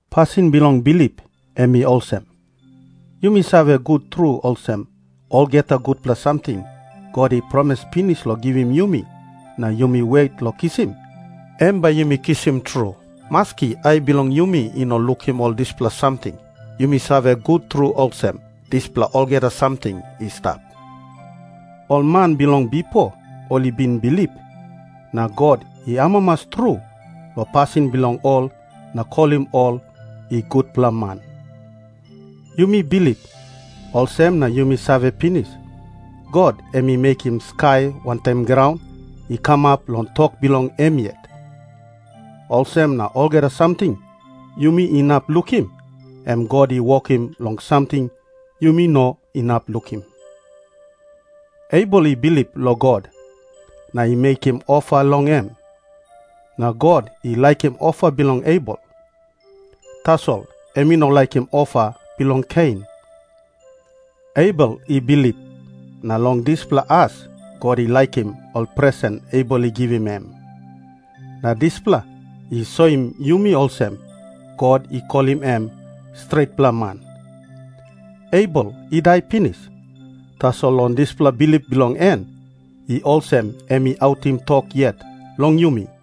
Pasin bilong bilip em i olsem. Yumi save gut tru olsem, olgeta gutpela samting God i promis pinis long givim yumi na yumi wet long kisim, em bai yumi kisim tru. Maski ai bilong yumi i no lukim ol dispela samting, yumi save gut tru olsem, dispela olgeta samting i stap. Ol man bilong bipo ol i bin bilip, na God i amamas tru long pasin bilong ol na kolim ol i gutpela man. Yumi bilip, olsem na yumi save pinis, God em i mekim skai wantaim graun i kamap long tok bilong em yet. Olsem na olgeta samting yumi inap lukim, em God i wokim long samting yumi no inap lukim. Abel i bilip long God, na i mekim ofa long em. Na God i laikim ofa bilong Abel, tasol em i no laikim ofa bilong Kein. Abel i bilip, na long dispela as God i laikim ol presen Abel i givim em. Na dispela i soim yumi olsem God i kolim em stretpela man. Abel i dai pinis, tasol long dispela bilip bilong en i olsem em i autim tok yet long yumi.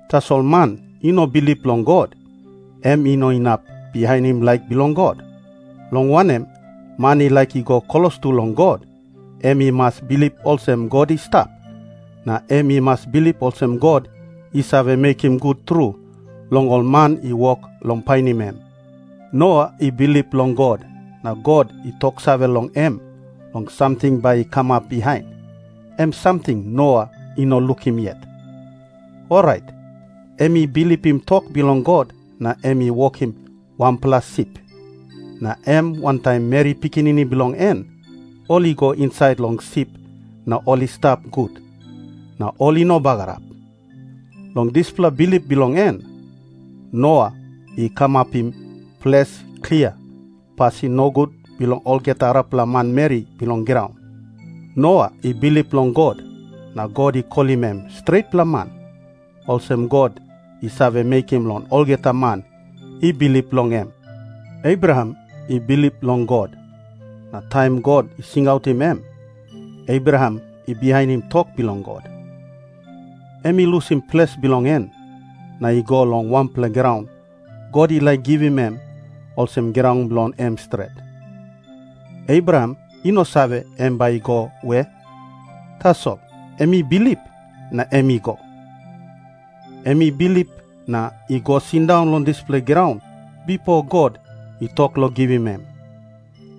Tasol man i no bilip long God, em i no inap bihainim laik bilong God. Long wanem, man i laik i go klostu long God, em i mas bilip olsem God i stap, na em i mas bilip olsem God i save mekim gut tru long ol man i wok long painim em. Noa i bilip long God, na God i toksave long em long samting bai i kamap bihain, em samting Noa i no lukim yet. Orait em i bilipim tok bilong God na em i wokim wanpela sip. Na em wantaim meri pikinini bilong en ol i go insait long sip na ol i stap gut, na ol i no bagarap. Long dispela bilip bilong en, Noa i kamapim ples klia pasin nogut bilong olgeta arapela manmeri bilong graun. Noa i bilip long God na God i kolim em stretpela man, olsem God i save mekim long olgeta man i bilip long em. Abraham i bilip long God, na taim God i singautim em, Abraham i bihainim tok bilong God. Em i lusim ples bilong en, na i go long wanpela graun God i laik givim em olsem graun bilong em stret. Abraham i no save em bai i go we, tasol em i bilip, na em i go. Em i bilip na i go sindaun long dispela graun bipo God i tok long givim em.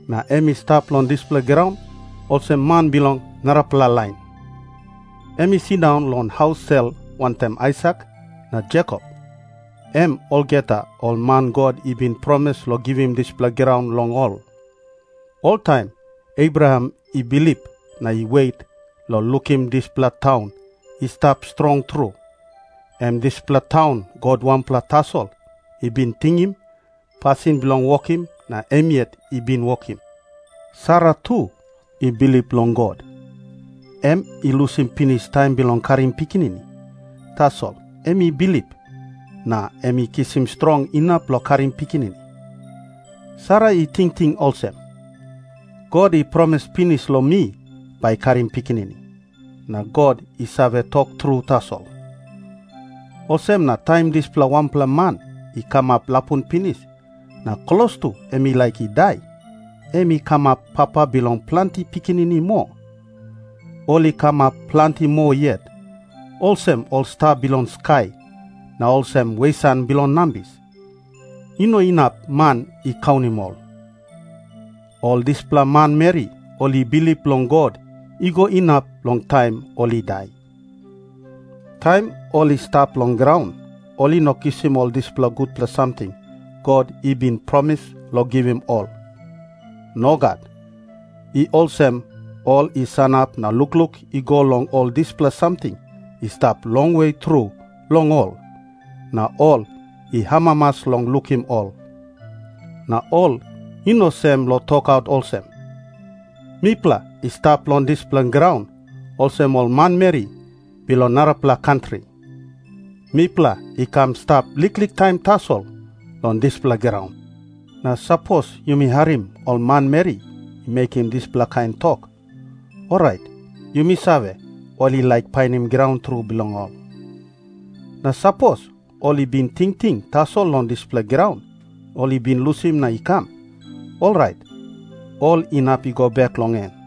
Na em i stap long dispela graun olsem man bilong narapela lain. Em i sindaun long haus sel wantaim Aisak na Jekop, em olgeta ol man God i bin promis long givim dispela graun long ol. Oltaim Abraham i bilip na i wet long lukim dispela taun i stap strong tru, em dispela taun God wanpela tasol i bin tingim pasin bilong wokim na em yet i bin wokim. Sara tu i bilip long God. Em i lusim pinis taim bilong karim pikinini, tasol em i bilip, na em i kisim strong inap long karim pikinini. Sara i tingting olsem, "God i promis pinis long mi bai karim pikinini. Na God i save tok tru tasol." Olsem na taim dispela wanpela man i kamap lapun pinis na klostu em i laik i dai, em i kamap papa bilong planti pikinini moa. Ol i kamap planti moa yet, olsem ol sta bilong skai na olsem wesan bilong nambis. I no inap man i kaunim ol. Ol dispela manmeri ol i bilip long God i go inap long taim ol i dai. Taim ol i stap long graun, ol i no kisim ol dispela gutpela samting God i bin promis long givim ol. Nogat. I olsem ol i sanap na lukluk i go long ol dispela samting i stap longwe tru long ol, na ol i amamas long lukim ol. Na ol i no sem long tokaut olsem, "Mipela i stap long dispela graun olsem ol manmeri bilong narapela kantri. Mipela i kam i stap liklik taim tasol long dispela graun." Na sapos yumi harim ol manmeri i mekim dispela kain tok, orait yumi save, ol i laik painim graun tru bilong ol. Na sapos ol i bin tingting tasol long dispela graun ol i bin lusim na i kam, orait ol inap i go bek long en.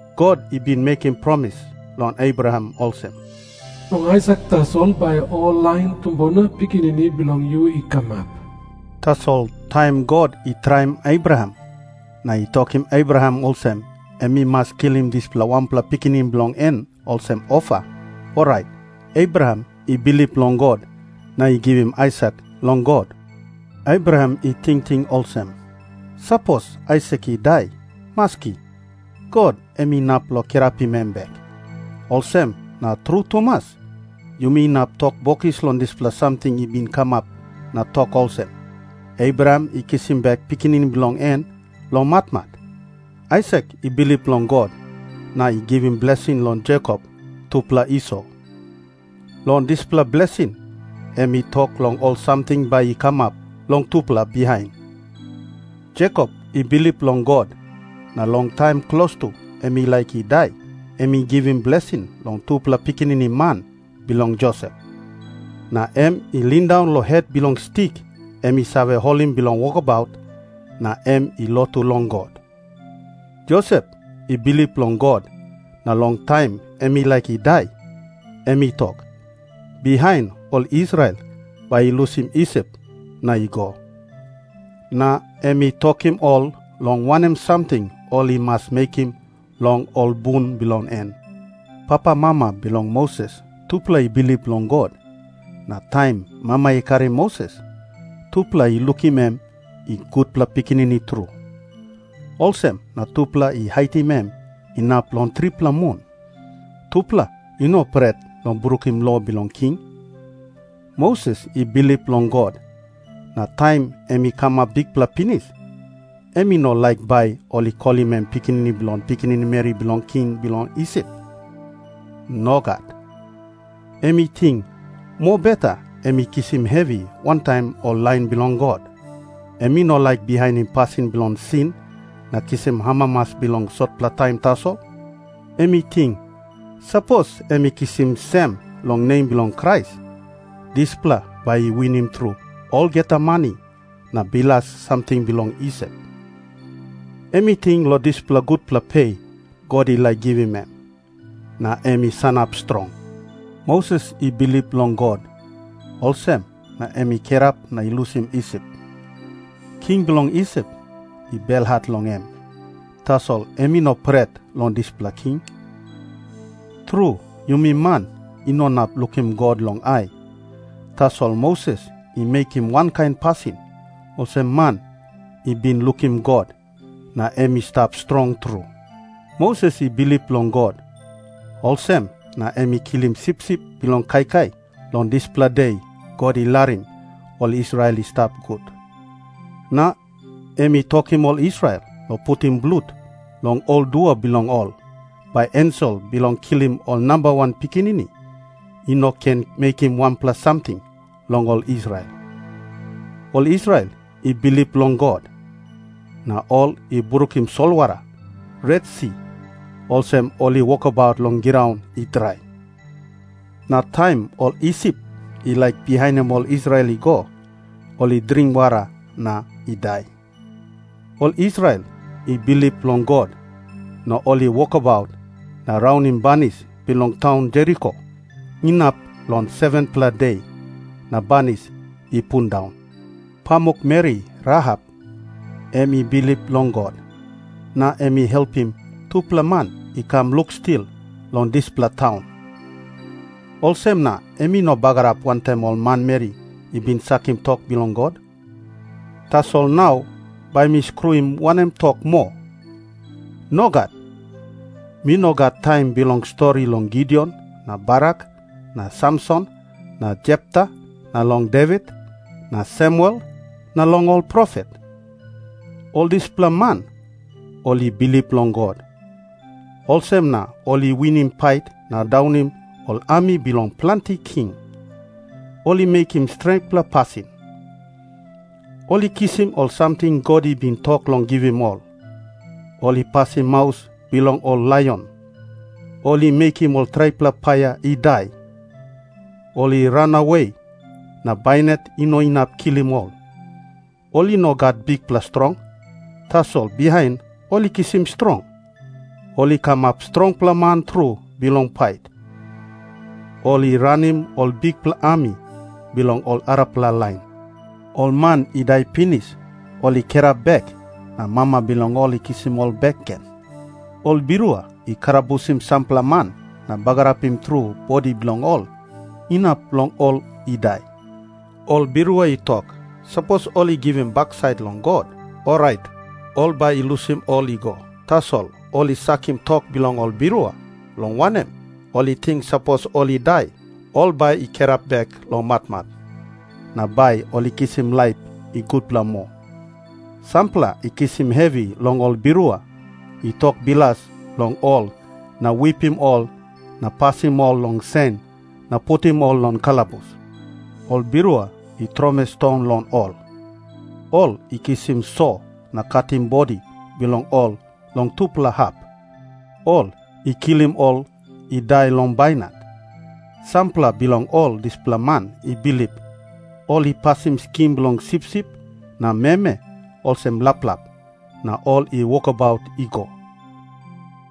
God i bin mekim promis long Abraham olsem, "Long Aisak tasol bai ol lain tumbuna pikinini bilong yu i kamap." Tasol taim God i traim Abraham, na i tokim Abraham olsem em i mas kilim dispela wanpela pikinini bilong en olsem ofa, orait Abraham i bilip long God na i givim Aisak long God. Abraham i tingting olsem, "Sapos Aisak i dai, maski, God em inap long kirapim em bek." Olsem na tru tumas, yumi inap tok bokis long dispela samting i bin kamap na tok olsem, Abraham i kisim bek pikinini bilong en long matmat. Aisak i bilip long God na i givim blesing long Jekop tupela Iso. Long dispela blesing em i tok long ol samting bai i kamap long tupela bihain. Jekop i bilip long God, na long taim klostu em i laik i dai, em i givim blesing long tupela pikinini man bilong Josep. Na em i lindaun long het bilong stik em i save holim bilong wokabaut, na em i lotu long God. Josep i bilip long God, na long taim em i laik i dai, em i tok, bihain ol Israel bai i lusim Isip na i go. Na em i tokim ol long wanem samting ol i mas mekim long ol bun bilong en. Papamama bilong Moses tupela i bilip long God, na taim mama i karim Moses, tupela i lukim em i gutpela pikinini tru. Olsem na tupela i haitim em inap long tripela mun. Tupela i no pret long brukim lo bilong king. Moses i bilip long God, na taim em i kamap bikpela pinis, em i no laik bai ol i kolim em pikinini bilong pikinini meri bilong king bilong Isip. Nogat. Em i ting, mobeta em i kisim hevi wantaim ol lain bilong God. Em i no laik bihainim pasin bilong sin na kisim amamas bilong sotpela taim tasol. Em i ting, sapos em i kisim sem long nem bilong Krais, dispela bai i winim tru olgeta mani na bilas samting bilong Isip. Em i ting long dispela gutpela pe God i laik givim em, na em i sanap strong. Moses i bilip long God, olsem na em i kirap na i lusim Isip. King bilong Isip i belhat long em, tasol em i no pret long dispela king. Tru, yumi man i no inap lukim God long ai, tasol Moses i mekim wankain pasin olsem man i bin lukim God, na em i stap strong tru. Moses i bilip long God, olsem na em i kilim sipsip bilong kaikai long dispela de God i larim ol Israel i stap gut. Na em i tokim ol Israel long putim blut long ol dua bilong ol, bai ensel bilong kilim ol namba wan pikinini i no ken mekim wanpela samting long ol Israel. Ol Israel i bilip long God, na ol i brukim solwara Retsi olsem ol i wokabaut long graun i drai. Na taim ol Isip i laik bihainim ol Israel i go, ol i dring wara na i dai. Ol Israel i bilip long God, na ol i wokabaut na raunim banis bilong taun Jeriko inap long 7-pela de, na banis i pundaun. Pamukmeri Rahap em i bilip long God, na em i helpim tupela man i kam lukstil long dispela taun. Olsem na em i no bagarap wantaim ol manmeri i bin sakim tok bilong God. Tasol nau bai mi skruim wanem tok moa? Nogat. Mi no gat taim bilong stori long Gideon na Barak na Samson na Jepta na long Devit na Samuel na long ol profet. Ol dispela man ol i bilip long God, olsem na ol i winim pait na daunim ol ami bilong planti king. Ol i mekim stretpela pasin. Ol i kisim ol samting God i bin tok long givim ol. Ol i pasim maus bilong ol laion. Ol i mekim ol traipela paia i dai. Ol i ranawe na bainat i no inap kilim ol. Ol i no gat bikpela strong, tasol bihain ol i kisim strong. Ol i kamap strongpela man tru bilong pait. Ol i ranim ol bikpela ami bilong ol arapela lain. Ol man i dai pinis ol i kirap bek, na mama bilong ol i kisim ol bek gen. Ol birua i kalabusim sampela man na bagarapim tru bodi bilong ol, inap long ol i dai. Ol birua i tok, sapos ol i givim baksait long God, orait ol bai i lusim ol i go. Tasol ol i sakim tok bilong ol birua, long wanem, ol i ting sapos ol i dai, ol bai i kirap bek long matmat, na bai ol i kisim laip i gutpela moa. Sampela i kisim hevi long ol birua i tok bilas long ol na wipim ol na pasim ol long sen na putim ol long kalabus. Ol birua i tromoi ston long ol. Ol i kisim so na katim bodi bilong ol long tupela hap. Ol i kilim ol i dai long bainat. Sampela bilong ol dispela man i bilip, ol i pasim skin bilong sipsip na meme olsem laplap, na ol i wokabaut i go.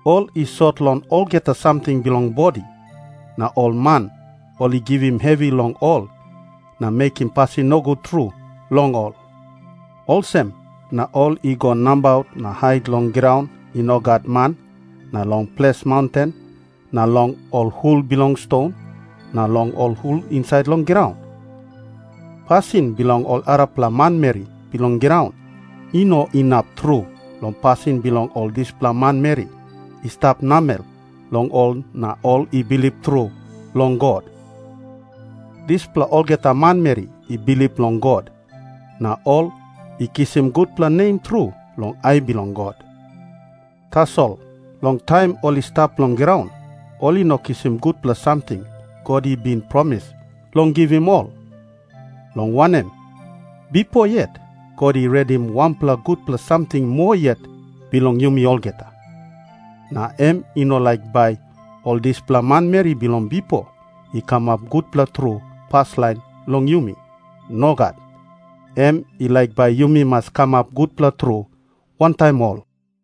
Ol i sot long olgeta samting bilong bodi, na ol man ol i givim hevi long ol na mekim pasin nogut tru long ol. Olsem na ol i go nabaut na hait long graun i no gat man na long ples maunten na long ol hul bilong ston na long ol hul insait long graun. Pasin bilong ol arapela manmeri bilong graun i no inap tru long pasin bilong ol dispela manmeri i stap namel long ol na ol i bilip tru long God. Dispela olgeta manmeri i bilip long God, na ol i kisim gutpela nem tru long ai bilong God. Tasol long taim ol i stap long graun ol i no kisim gutpela samting God i bin promis long givim ol, long wanem, bipo yet God i redim wanpela gutpela samting moa yet bilong yumi olgeta. Na em i no laik bai ol dispela manmeri bilong bipo i kamap gutpela tru paslain long yumi. Nogat. Em i laik bai yumi mas kamap gutpela tru wantaim ol.